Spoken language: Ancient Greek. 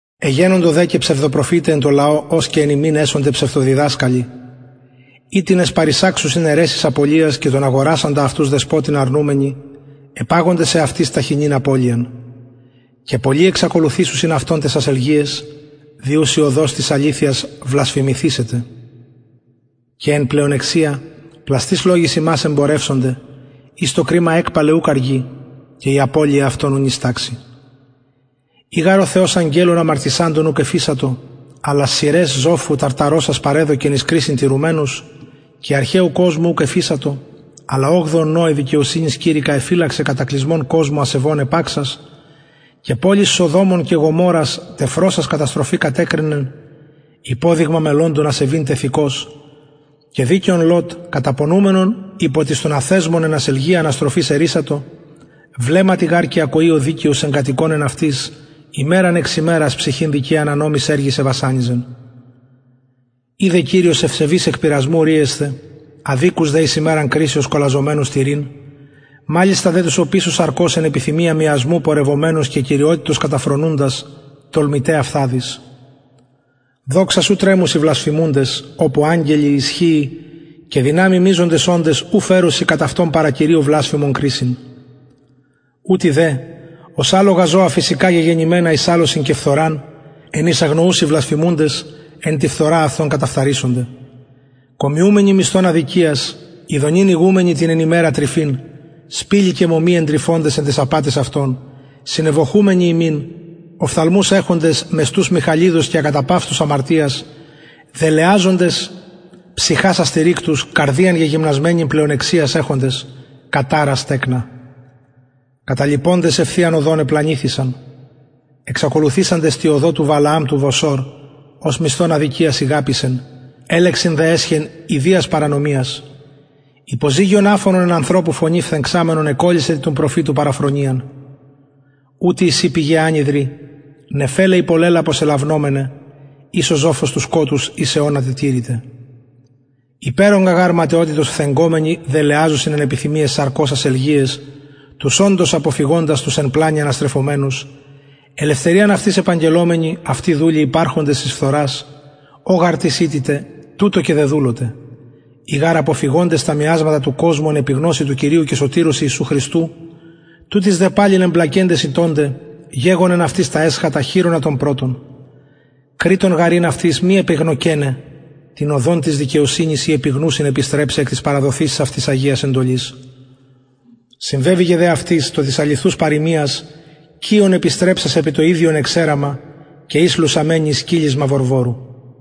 εγενοντο δε και ψευδοπροφηται εν τω λαω ως και εν υμιν εσονται ψευδοδιδασκαλοι οιτινες παρεισαξουσιν αιρεσεις απωλειας και τον αγορασαντα αυτους δεσποτην αρνουμενοι επαγοντες εαυτοις ταχινην απωλειαν και πολλοι εξακολουθησουσιν αυτων ταις ασελγειαις δι ους η οδος της αληθειας βλασφημηθησεται και εν πλεονεξια πλαστοις λογοις υμας εμπορευσονται οις το κριμα εκπαλαι ουκ αργει και η απωλεια αυτων ου νυσταξει ει γαρ ο θεος αγγελων αμαρτησαντων ουκ εφεισατο αλλα σειραις ζοφου ταρταρωσας παρεδωκεν εις κρισιν τηρουμενους και αρχαιου κοσμου ουκ εφεισατο αλλα ογδοον νωε δικαιοσυνης κηρυκα εφυλαξεν κατακλυσμον κοσμω ασεβων επαξας και πολεις σοδομων και γομορρας τεφρωσας καταστροφη κατεκρινεν υποδειγμα μελλοντων ασεβειν τεθεικως και δικαιον λωτ καταπονουμενον υπο της των αθεσμων εν ασελγεια αναστροφης ερρυσατο βλεμματι γαρ και ακοη ο δικαιος εγκατοικων εν αυτοις ημεραν εξ ημερας ψυχην δικαιαν ανομοις εργοις εβασανιζεν οιδεν κυριος ευσεβεις εκ πειρασμου ρυεσθαι αδικους δε εις ημεραν κρισεως κολαζομενους τηρειν μαλιστα δε τους οπισω σαρκος εν επιθυμια μιασμου πορευομενους και κυριοτητος καταφρονουντας τολμηται αυθαδεις δοξας ου τρεμουσιν βλασφημουντες οπου αγγελοι ισχυι και δυναμει μειζονες οντες ου φερουσιν κατ αυτων παρα κυριω βλασφημον κρισιν ουτοι δε ως αλογα ζωα φυσικα γεγενημενα εις αλωσιν και φθοραν εν οις αγνοουσιν βλασφημουντες εν τη φθορα αυτων καταφθαρησονται κομιουμενοι μισθον αδικιας ηδονην ηγουμενοι την εν ημερα τρυφην σπιλοι και μωμοι εντρυφωντες εν ταις απαταις αυτων συνευωχουμενοι υμιν οφθαλμους εχοντες μεστους μοιχαλιδος και ακαταπαυστους αμαρτιας δελεαζοντες ψυχας αστηρικτους καρδιαν γεγυμνασμενην πλεονεξιας εχοντες καταρας τεκνα καταλιποντες ευθειαν οδον επλανηθησαν εξακολουθησαντες τη οδω του βαλααμ του βοσορ ος μισθον αδικιας ηγαπησεν ελεγξιν δε εσχεν ιδιας παρανομιας υποζυγιον αφωνον εν ανθρωπου φωνη φθεγξαμενον εκωλυσεν την του προφητου παραφρονιαν ουτοι εισιν πηγαι ανυδροι νεφελαι υπο λαιλαπος ελαυνομεναι οις ο ζοφος του σκοτους εις αιωνα τετηρηται υπερογκα γαρ ματαιοτητος φθεγγομενοι δελεαζουσιν εν επιθυμιαις σαρκος ασελγειαις τους οντως αποφυγοντας τους εν πλανη αναστρεφομενους ελευθεριαν αυτοις επαγγελλομενοι αυτοι δουλοι υπαρχοντες της φθορας ω γαρ τις ηττηται τουτω και δεδουλωται ει γαρ αποφυγοντες τα μιασματα του κοσμου εν επιγνωσει του κυριου και σωτηρος ιησου χριστου τουτοις δε παλιν εμπλακεντες ηττωνται γεγονεν αυτοις τα εσχατα χειρονα των πρωτων κρειττον γαρ ην αυτοις μη επεγνωκεναι την οδον της δικαιοσυνης η επιγνουσιν επιστρεψαι εκ της παραδοθεισης αυτοις αγιας εντολης συμβεβηκεν δε αυτοις το της αληθους παροιμιας κυων επιστρεψας επι το ιδιον εξεραμα και υς λουσαμενη εις κυλισμα βορβορου